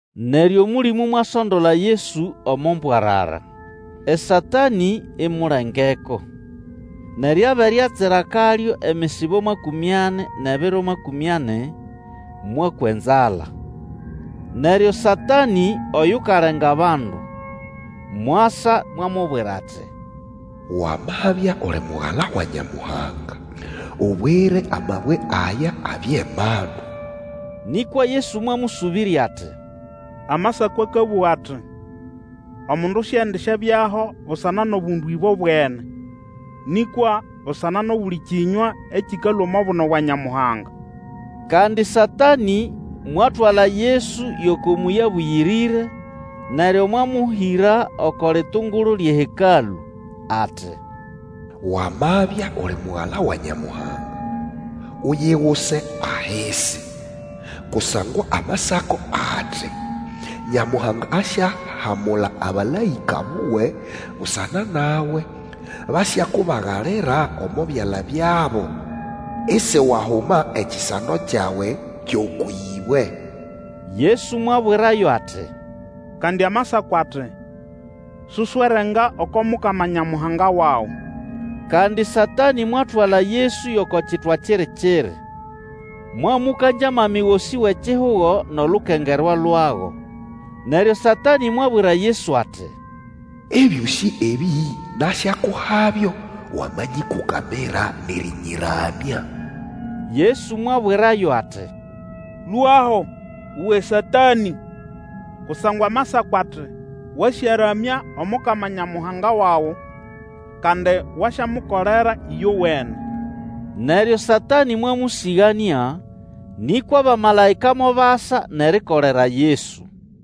Neryo Omũlĩmũ mwasondola Yesu omo mbwarara, eSatanĩ imulengeko. Neryo abere atsira akalyo emisibo makũmĩ ani nʼebiro makũmĩ ani, mwakwa enzala. Neryo Satanĩ oyukalenga abandu, mwasa mwamubwira ati, Wamabya uli Mugala wa Nyamuhanga, ubwire amabwe aya abye mandu. Nĩkwa Yesu mwamũsũbĩrya ati, Amasako akabũga ati, Omundu siendisyabyaho busana nʼobundu ĩbobwene, nĩkwa busana nʼobuli kĩnywa ekĩkalũa omo buno bwa Nyamuhanga. Kandi Satanĩ mwatwala Yesu yʼoko Mũyĩ Abũyĩrĩre; neryo mwamũhĩra oko litungulu lyʼeHekalũ, ati, Wamabya uli Mugala wa Nyamuhanga, uyiguse ahisi; kusangwa Amasako ati, Nyamuhanga ayahamula abamalaĩka buwe busana nawe, Basyakubagalira omo byala byabo, Isiwahuma ekisando kyawe kyʼokwʼĩbwe. Yesu mwabwirayo ati, Kandi Amasako ati, Susyerenga oko Mukama Nyamuhanga wawe. Kandi Satanĩ mwatwala Yesu yʼoko kitwa kiri-kiri, mwamũkangya amami gosĩ wʼekihugo nʼolukengerwa lwago. Neryo Satanĩ mwabwira Yesu ati, Ebyosĩ ebĩ nasyakuhabyo wamanyĩkũkamira nʼerĩnyĩramya. Yesu mwabwirayo ati, Lũaho, uwe Satanĩ! Kusangwa Amasako ati, Wasyaramya Omukama Nyamuhanga wawe, kandi wasyamukolera ĩyowene. Neryo Satanĩ mwamũsĩganĩa; nĩkwa abamalaĩka mobasa nʼerikolera Yesu.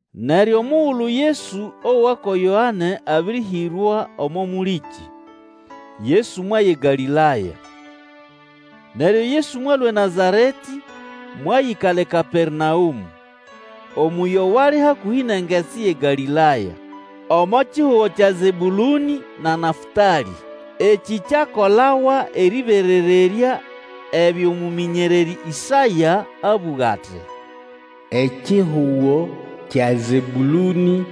Neryo omugulu Yesu owa ko Yoane abĩrĩhĩrwa omo mũlĩkĩ, Yesu mwaya eGalĩlaya. Neryo Yesu mwalũa eNazaretĩ, mwayĩkala eKapernaũmũ, omũyĩ owali hakũhĩ nʼengetsi yʼeGalĩlaya, omo kihugo kya Zebũlũnĩ na Nafũtalĩ. Ekĩ kyakolawa erĩberererya ebyo mũmĩnyererĩ Ĩsaya abũga ati, Ekihugo kya Zebũlũnĩ,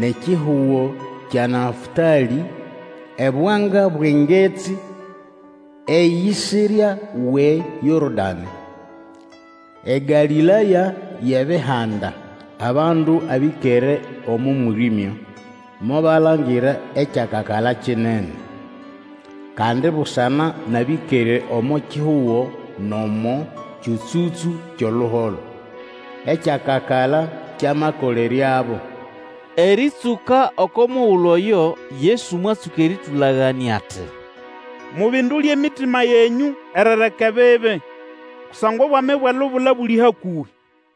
nʼekihugo kya Nafũtalĩ, Ebwanga bwʼengetsi, eyisirya wʼeYorodanĩ, EGalĩlaya yʼEbihanda! Abandu abĩkere omo mwĩrĩmya, Mobalangira ekyakakala kinene! Kandi busana nʼabĩkere omo kihugo nʼomo kyũtsũtsũ kyʼoluholo, Ekyakakala kyamakoleryabo! Erĩtsũka oko mugulu oyo Yesu mwatsũka erĩtũlaganĩa ati, Mubindule emitima yenyũ erireka ebibi, kusangwa obwami bwʼelubula buli hakũhĩ!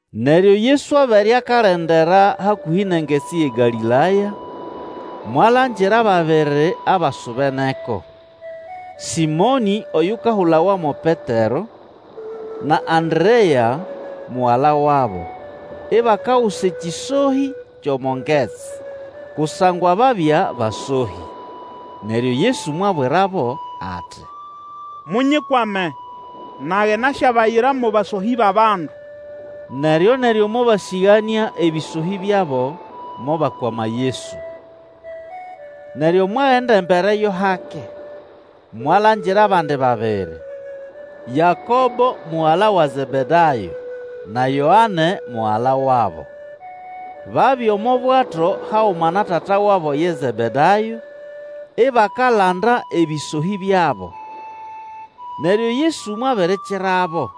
Neryo Yesu abere akalendera hakũhĩ nʼengetsi yʼeGalĩlaya, mwalangira ababiri abasubeneko, Sĩmonĩ oyukahulawa mo Petero, na Anderea, mugala wabo, ibakagusa ekĩsohĩ kyʼomo ngetsi; kusangwa babya basohĩ. Neryo Yesu mwabwirabo ati, Munyikwame, nage nasyabayira mo basohĩ bʼabandu. Neryoneryo mobasĩganĩa ebĩsohĩ byabo, mobakwama Yesu. Neryo mwagenda embere yo hake, mwalangira abandi babiri, Yakobo mugala wa Zebedayo, na Yoane mugala wabo. Babya omo bwato haguma na tata wabo ye Zebedayo, ibakalanda ebĩsohĩ byabo. Neryo Yesu mwabirikirabo.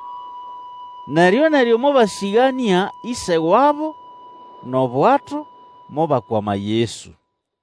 Neryo-neryo mobasĩganĩa ĩse wabo, nʼobwato, mobakwama Yesu.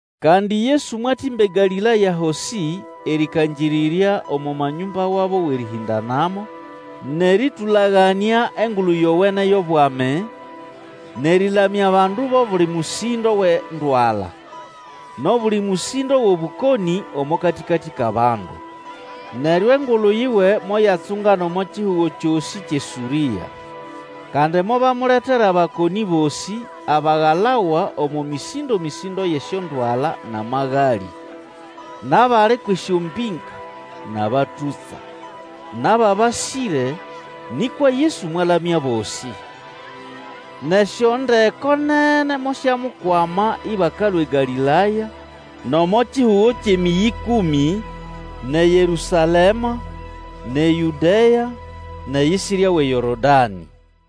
Kandi Yesu mwatĩmba eGalĩlaya hosĩ, erĩkangĩrĩrya omo manyũmba wabo wʼerĩhĩndanamo, nʼerĩtũlaganĩa Engulu Yowene yʼobwami, nʼerĩlamya abandu bʼobuli mũsĩndo wʼendwala, nʼobuli mũsĩndo wʼobũkonĩ omo katĩkatĩ kʼabandu. Neryo engulu yiwe moyatsungana omo kihugo kyosĩ kyʼeSũrĩa. Kandi mobamuletera abakonĩ bosĩ, abagalawa omo mĩsĩndo-mĩsĩndo yʼesyondwala nʼamagalĩ, nʼabali kwʼesyombĩnga, nʼabatũtsa, nʼababasĩre, nĩkwa Yesu mwalamya abosĩ. Nʼesyondeko nene mosyamukwama ĩbakalũa eGalĩlaya, nʼomo kihugo kyʼeMĩyĩ Ĩkũmĩ, nʼeYerũsalema, nʼe Yũdea, nʼeyisirya wʼeYorodanĩ.